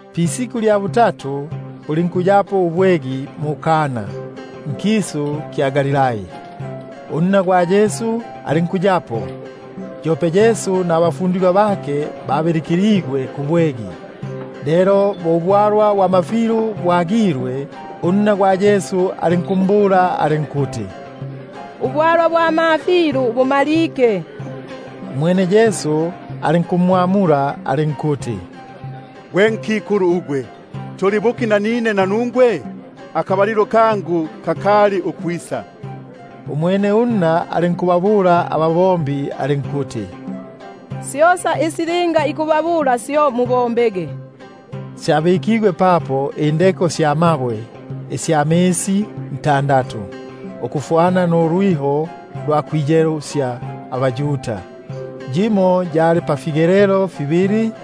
Pisiku lya butatu, bulinkuyapo ubwegi mu-Kana nkisu kya Galilai, unna gwa Yesu alinkuya papo. Yope Yesu nabafundigwa bake, babilikiligwe kubwegi. Lelo bo ubwalwa bwa mafilu bwagilwe, unna gwa Yesu alinkumbula alinkuti: Ubwalwa bwa mafilu bumalike. Umwene Yesu alinkumbula alinkuti: Gwe nkikulu, tuli buki nanine nanungwe? Akaba- lilo kangu kakali ukwisa. Umwene unna alinkubabula ababombi alinkuti: Syosa isi linga ikubabula, syo mubombege. Syabikigwe papo indeko sya mabwe ntandatu, ukufwana nulwiho lwa kwiyelusya abaYuda, yimo yali pafigelelo fibili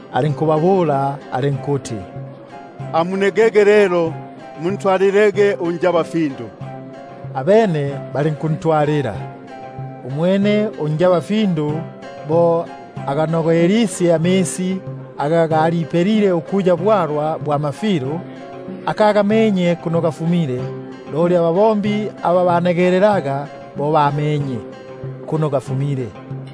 Alinkubabula alinkuti: Amunegege lelo, muntwalile unjaba- findu; abene balinkuntwalila. Umwene unjabafindu bo aganogelisye amisi aga galipelile ukuya bwalwa bwa mafilu, akagamenye kuno gafumile — loli ababombi aba banegelelaga amisi, bo bamenye,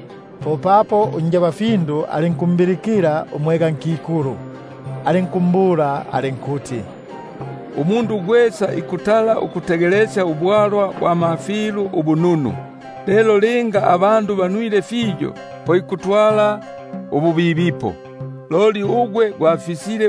— popapo unjabafindu alinkumbilikila umwegankikulu, alinkumbula alinkuti: Umundu gwesa ikutala ukutegelesya ubwalwa bwa mafilu ubununu, lelo linga abandu banwile fiyo, po ikwega ububibipo; loli ugwe gwafisile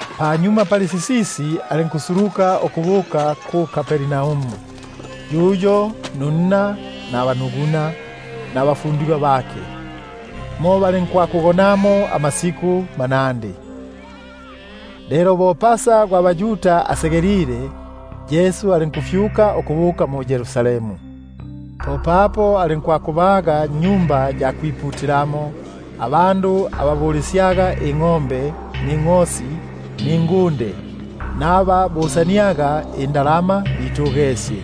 Panyuma pali sisisi alinkusuluka ukubuka mu-Kapernaumu, yuyo, nunna, nabanuguna, nabafundigwa bake; mo balinkwakugonamo amasiku manandi. Lelo bo Pasa gwa baYuda asegelile, Yesu alinkufyuka ukubuka mu-Yerusalemu. Popapo alinkubaga mwa Tempeli abandu aba bulisyaga ingʼombe ningʼosi ningunde, naba busaniaga indalama, bitugesye.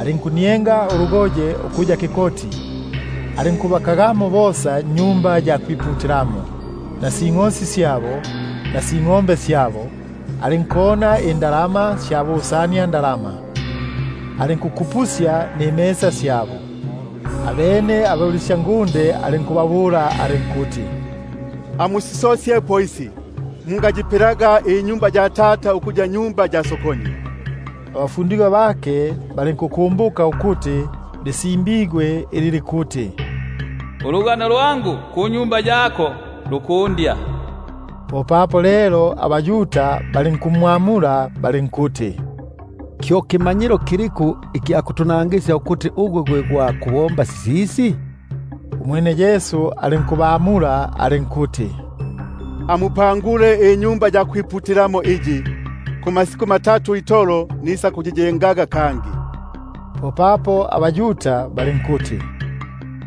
Alinkunienga ulugoye ukuya kikoti, alinkubakagamo bosa mwa Tempeli, alinkuti ingʼosi alinkuti ingʼombe, alinkona indalama sya busaniandalama, alinkukupusya nifitalati fyabo. Abene abulisyangunde alinkubabula alinkuti: Amusisosyepo isi, mungayipelaga inyumba ya Tata ukuya nyumba ya sokoni. Abafundigwa bake balinkukumbuka ukuti lisimbigwe ili likuti: Ilyoyo panogwa ya nyumba yako lisakundya. Popapo lelo abaYuda balinkumwamula balinkuti: Kyo kimanyilo kiliku ikya kutunangisya, ukuti gwe gwa kubomba sisisi? Umwene Yesu alinkubamula alinkuti: Amubulutule Tempeli uyu, kumasiku matatu itolo nisakunjengaga kangi. Popapo abaYuda balinkuti: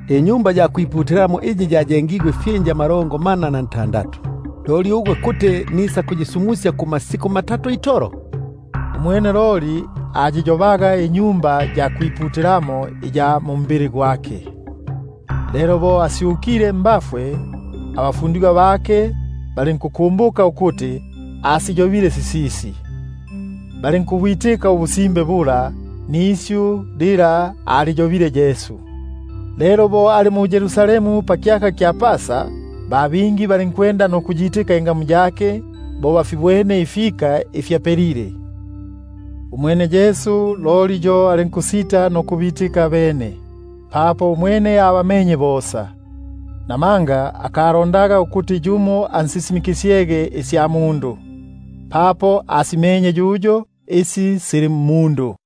Tempeli uyu ayengigwe ifyinja amalongo mana na ntandatu, loli ugwe kuti nisakunsumusya kumasiku matatu itolo? Umwene loli anjobaga Tempeli ugwa mbili gwake. Lelo bo asyukile mbafwe, abafundigwa bake balinkukumbuka ukuti asiyobile sisisi, balinkubwitika ubusimbe bula, nisyu lila aliyobile Yesu. Lelo bo ali mu-Yerusalemu pakyaka kya Pasa, ba bingi balinkuyitika ingamu yake bo bafibwene ifika ifi afipelile. Umwene Yesu alinkusita nukwibika mmyabo, papo umwene abamenye bosa, namanga akalondaga ukuti yumo ansisimikisye isya mundu, papo asimenye yuyo isi sili mmundu.